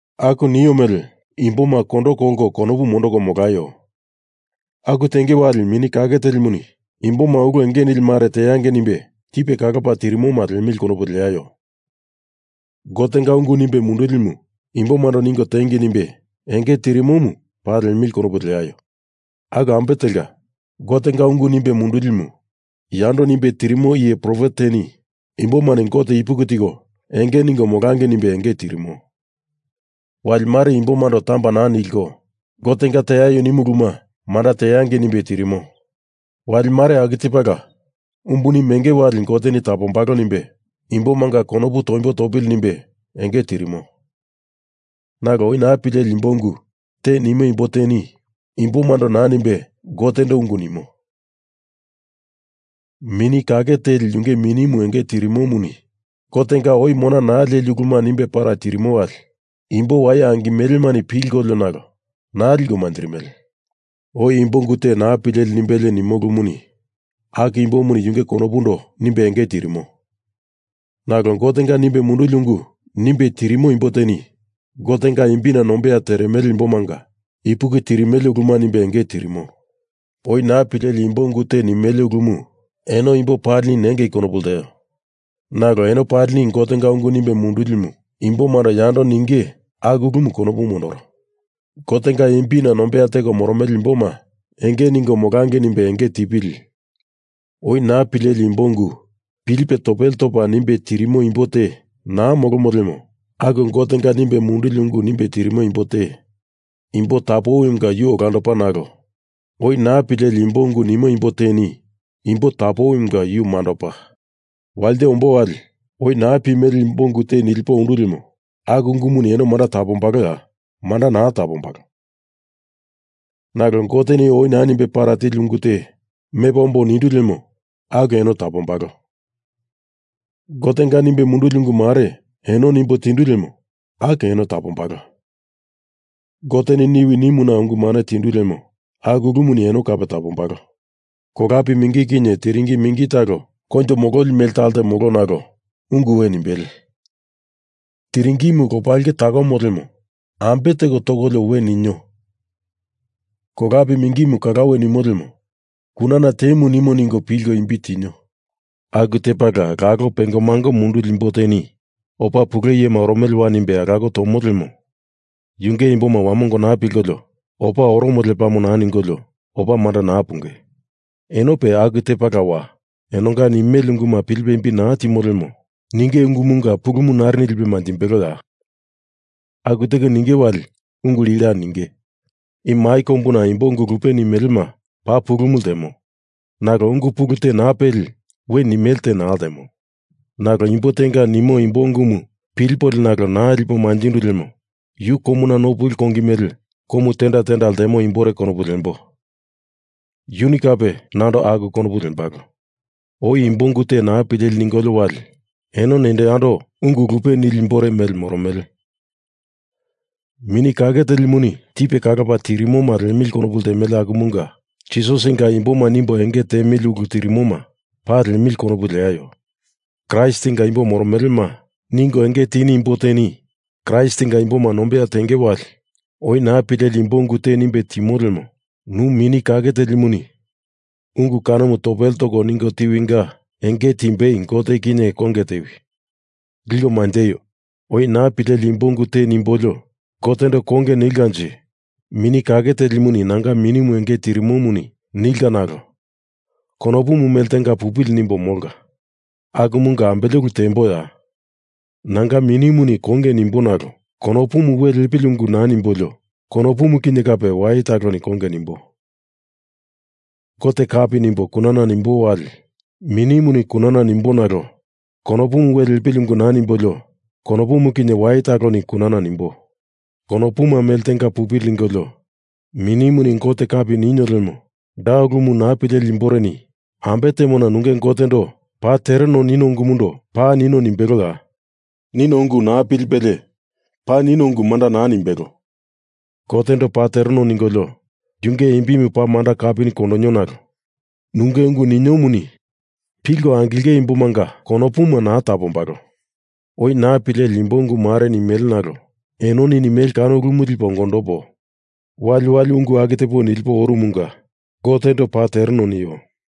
Aku nio mele imboma kondo kolko konopu mondoko molaio! Aku tenge wali Mini Kake Telimuni imboma ulu enge nili mare teangei nimbe tipe kalopa tirimoma liemili konopu leaio. Gotenga ungu nimbe mundulimu imbomando ningo tiengei nimbe enge tirimomu paa liemili konopu leaio. Aku ambe telka, Gotenga ungu nimbe mundulimu yando nimbe tirimo iye profet teni imbomani Gote ipuki tiko enge ningo molangei nimbe enge tirimo. Wali mare imbomando tamba naa nilko Gotenga teaio nimu uluma manda teangei nimbe tirimo. Wali mare aku tepala umbuni meangei wali Goteni tapombalo nimbe imbomanga konopu toimbo topili nimbe enge tirimo. Nalo oi naa pileli imbo ungu te nimo imbo teni imbomando naa nimbe Gotendo ungu nimo. Mini Kake Teli yunge minimu enge tirimomuni Gotenga oi mona naa leli uluma nimbe para tirimo wali imbo waye angimelemani pilkolio nalo naa liko manjirimele. Oi imbo ungu te naa pileli nimbelie nimo ulumuni aku imbomuni yunge konopundo nimbe enge tirimo. Nalo Gotenga nimbe munduli ungu nimbe tirimo imbo teni Gotenga imbina nombeya teremele imbomanga ipuki tirimele uluma nimbe enge tirimo. Oi naa pileli imbo ungu te nimele ulumu eno imbo palini nengei konopu lteo. Nalo eno palini Gotenga ungu nimbe mundulimu imbomando yando ninge aku ulumu konopu mondoro. Gotenga imbina nombeya teko moromele imboma enge ningo molangei nimbe enge tipili oi naa pileli imbo ungu pilipe topele topa nimbe tirimo imbo te naa molomo lemo, aku Gotenga nimbe munduli ungu nimbe tirimo imbo te imbo tapowinga yu olandopa nalo oi naa pileli imbo ungu nimo imbo teni imbo tapowinga yu mandopa. Walite ombo wali oi naa pimele imbo ungu te nilipo ondu lemo aku ungumuni eno manda tapombaloya? Manda naa tapombalo. Nalo Goteni oi naa nimbe para tili ungu te mepo ombo nindu lemo aku eno tapombalo. Gotenga nimbe munduli ungu mare eno nimbo tindu lemo aku eno tapombalo. Goteni niwi nimuna ungu mane tindu lemo aku ulumuni eno kape tapombalo. Kolape mingi kinye tiringi mingi talo koinjo mololi mele talte, molo, nalo ungu we nimbele. Tiringimu lopailke takomo lemo ambe teko tokolio we ninio. Kolape mingi kalawe nimo lemo kunana temu nimo ningo pilko imbi tinio. Aku tepala lalo pengomango munduli imbo teni opa pule iyema oromelewa nimbe alako tomo lemo yunge imboma wamongo naa pilkolio opa oromo lepamo naa ningolio opa manda naa punge. Enope aku tepalawa. Enonga nimele unguma pilipe imbi naa timo lemo ninge ungumunga pulumu narini lipe manjimbeloya? Aku teko ninge wali ungu lila ninge. I mai kombuna imbo ungu lupe nimelema paa pulumu ltemo. Nalo ungu pulu te naa peli we nimele te naa ltemo. Nalo imbo tenga nimo imbo ungumu pilipolio nalo naa lipo manjindu lemo yu komuna no puli kongi mele komu tenda tenda ltemo imbore konopu lembo. Yuni kape nando aku konopu lembalo. Oi imbo ungu te naa pileli ningolio wali eno nendo yando ungu lupe nili imbore mele moromele. Mini Kake Telimuni tipe kalopa tirimoma liemili konopu ltemele akumunga Jisasinga imboma nimbo enge tiemili ulu tirimoma paa liemili konopu leaio. Kraistinga imbo moromelema ningo enge tini imbo teni Kraistinga imboma nombeya tenge wali oi naa pileli imbo ungu te nimbe timo lemo nu Mini Kake Telimuni ungu kanomu topele toko niwinga enge timbei Gote kinye konge tewi. Liko manjeio. Oi naa pileli imbo ungu te nimbolio Gotendo konge nilkanje Mini Kake Telimu nanga minimu enge tirimomuni nilka nalo konopumu mele tenga pupili nimbo molka. Akumunga ambele ulu temboya? Nanga Minimuni konge nimbo nalo konopu we lepili ungu naa nimbolio konopumu kinye kape waye taloni konge nimbo. Gote kapi nimbo kunana nimbo wali minimuni kunana nimbo nalo konopu we lepili ungu naa nimbolio konopumu kinye waye taloni kunana nimbo. Konopuma mele tenga pupili ningolio minimuni Gote kapi ninio lemo da ulumu naa pileli imboreni ambe temona nunge Gotendo paa tereno nino ungumundo paa nino nimbeloya? Nino ungu naa pilipelie panino ungu manda naa nimbelo. Gotendo paa tereno ningolio yunge imbimu paa manda kapini kondonio nalo nunge ungu niniomuni pilko angilengei imbomanga konopuma naa tapombalo. Oi naa pileli imbo ungu mare nimele nalo enoni nimele ulu kanomu lipo ongondopo waliwali ungu aku tepo nilipo oromunga Gotendo paa tereno nio.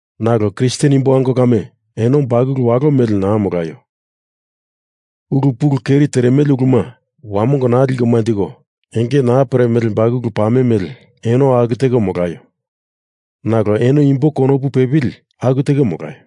Nalo Kristen imbo ango kame, eno bakulu walo mele naa molaio. Ulu pulu keri teremele uluma wamongo naa liko manjiko enge naa peremele bakulu pame mele eno aku teko molaio. Nalo eno imbo konopu pepili aku teko molaio.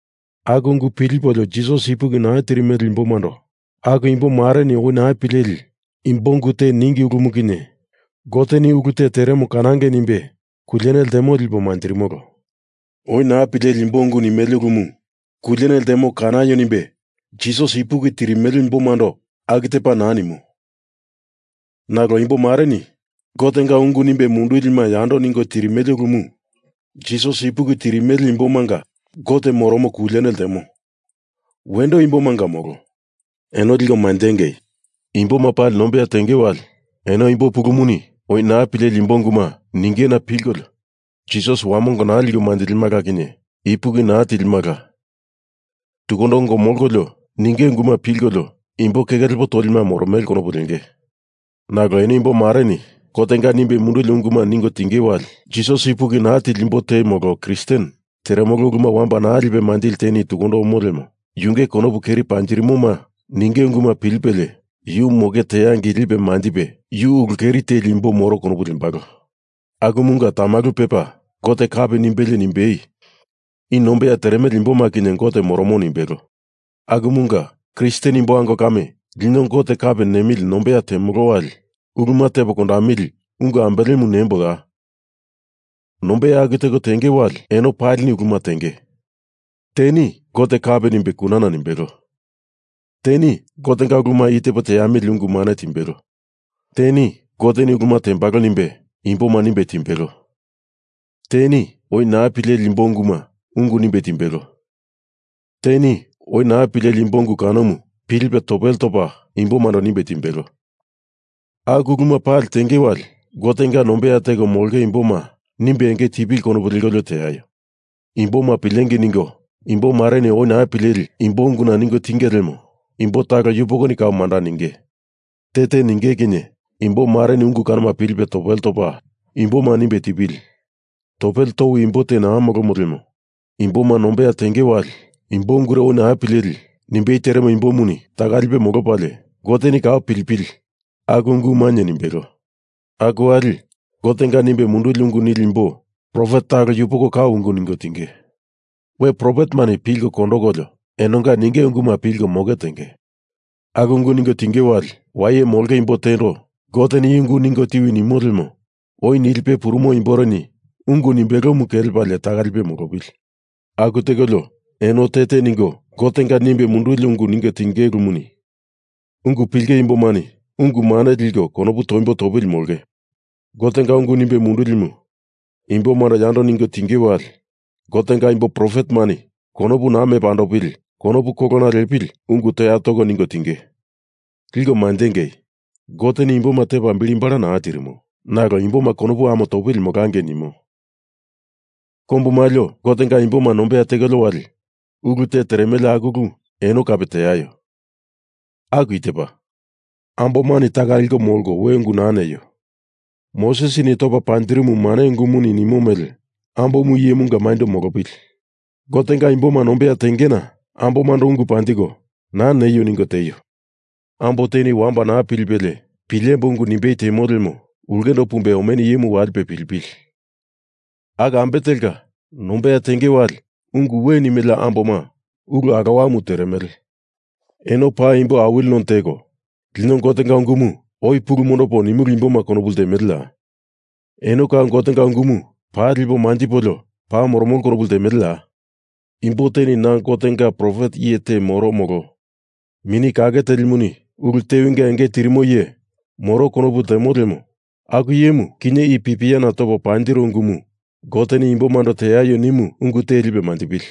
Aku ungu pilipolio Jisas ipuki naa tirimele imbomando aku imbo mareni oi naa pileli imbo ungu te ningi ulumu kinye Goteni ulu te teremo kanangei nimbe kuliene ltemo lipo manjirimolo. Oi naa pileli imbo ungu nimele ulumu kuliene ltemo kanaio nimbe Jisas ipuki tirimele imbomando aku tepa naa nimo. Nalo imbomareni Gotenga ungu nimbe mundulima yando ningo tirimele ulumu Jisas ipuki tirimele imbomanga Gote moromo kuliene ltemo. Wendo imbomanga molo. Eno liko manjengei. Imboma pali nombeya tenge wali, eno imbo pulumuni oi naa pileli imbo unguma ningena pilkolio Jisas wamongo naa liko manjilima kinye ipuki naa tilima tukundo ongo molkolio ninge unguma pilkolio imbo keke lepo tolima moromele konopu lenge. Nalo eno imbo mareni Gotenga nimbe munduli unguma ningo tinge wali Jisas ipuki naa tili imbo te molo Kristen teremolo uluma wamba naa lipe manjili teni tukundo omo lemo yunge konopu keri panjirimoma ninge unguma pilipelie yu moke teangei lipe manjipe yu ulu keri teli imbo moro konopu lembalo. Akumunga tamalu pepa Gote kapi nimbelie nimbei i nombeya teremele imboma kinye Gote moromo nimbelo. Akumunga, Kristen imbo ango kame, lino Gote kapi nemili nombeya temolo wali uluma tepo kondamili ungu ambelemu nemboya? Nombeya aku teko tenge wali eno palini uluma tenge. Teni Gote kapi nimbe kunana nimbelo. Teni Gotenga uluma i tepo teamili ungu mane timbelo. Teni Goteni uluma tembalo nimbe imboma nimbe timbelo. Teni oi naa pileli imbo unguna ungu nimbe timbelo. Teni oi naa pileli imbo ungu kanomu pilipe topele topa imbomando nimbe timbelo. Aku uluma pali tenge wali, Gotenga nombeya teko molonge imboma nimbe enge tipili konopu lekolio teaio. Imboma pilengei ningo imbomareni oi naa pileli imbo unguna ningo tinge lemo imbo talo yupoko kau manda ninge. Te te ninge kinye imboreni ungu kanoma pilipe topele topa imboma nimbe tipili. Topele towi imbo te naa molomo lemo imboma nombeya tenge wali imbo ungure oi naa pileli nimbei teremo imbomuni taka lipe molopalie Goteni kau pilipili aku ungu mainye nimbelo. Aku wali Gotenga nimbe munduli ungu nili imbo profet talo yupoko kau ungu ningo tinge. We profetemani pilko kondokolio enonga ninge unguma pilko moke tengei. Aku ungu ningo tinge wali, waye molonge imbo tendo Goteni i ungu ningo tiwi nimo lemo oi nilipe purumo imboreni ungu nimbelomu kelepalie taka lipe molopili. Aku tekolio eno te te ningo Gotenga nimbe munduli ungu ningo tinge ulumuni ungu pilinge imbomani ungu mane liko konopu toimbo topili molongei. Gotenga ungu nimbe mundulimu imbomando yando ningo tinge wali Gotenga imbo profetemani konopu naa mepa andopili konopu kolona lepili ungu toya toko ningo tinge. Liko manjengei. Goteni imboma tepa bili bala naa tirimo. Nalo imboma konopu ame topili molangei nimo. Kombu maliona Gotenga imboma nombeya tekolio wali ulu te teremele aku ulu eno kape teaio. Aku i tepa. Ambomani taka liko molko we ungu naa neio. Mosesini topa panjirimu mane ungumuni nimo mele ambomu iyemanga maindo molopili. Gotenga imboma nombeya tengena ambomando ungu panjiko naa neio ningo tieio. Ambo teni wamba naa pilipelie pilemboi ungu nimbei temo lemo ulke pumbelie omenu iyemu walipe pilipili. Aku ambe telka nombeya tenge wali ungu we nimele amboma ulu alowamu teremele. Eno imbo awili none teko lino Gotenga ungumu oi pulu mondopo nimulu imboma konopu ltemeleya? Eno kau Gotenga ungumu paa liko manjikolio paa moromolo konopu ltemeleya? Imbo teni na Gotenga iye profet te moro molo Mini Kake Telimuni ulu tewinga enge tirimo iye moro konopu ltemo lemo aku iyemu kinye i pipiana topo panjiro ungumu Goteni imboma teaio nimu ungu te lipe manjipili.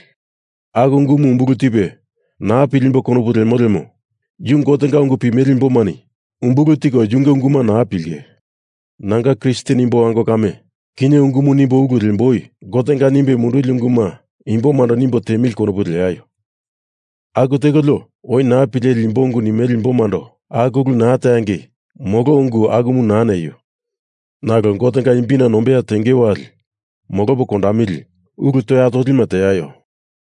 Aku ungumu umbulu tipe naa pilimboi konopu lemo lemo, yu Gotenga ungu pimele imbomani umbulu tiko yunge unguma naa pilinge. Nanga Kristen imbo ango kame, kinye i ungumu nimbo ulu lemboi. Gotenga nimbe munduli unguma imbomando nimbo tiemili konopu leaio. Aku tekolio, oi naa pileli imbo ungu nimele imbomando aku ulu naa teangei molo ungu akumu naa neio. Nalo Gotenga imbina nombeya tenge wali, molopo kondamili ulu toya tolima teaio.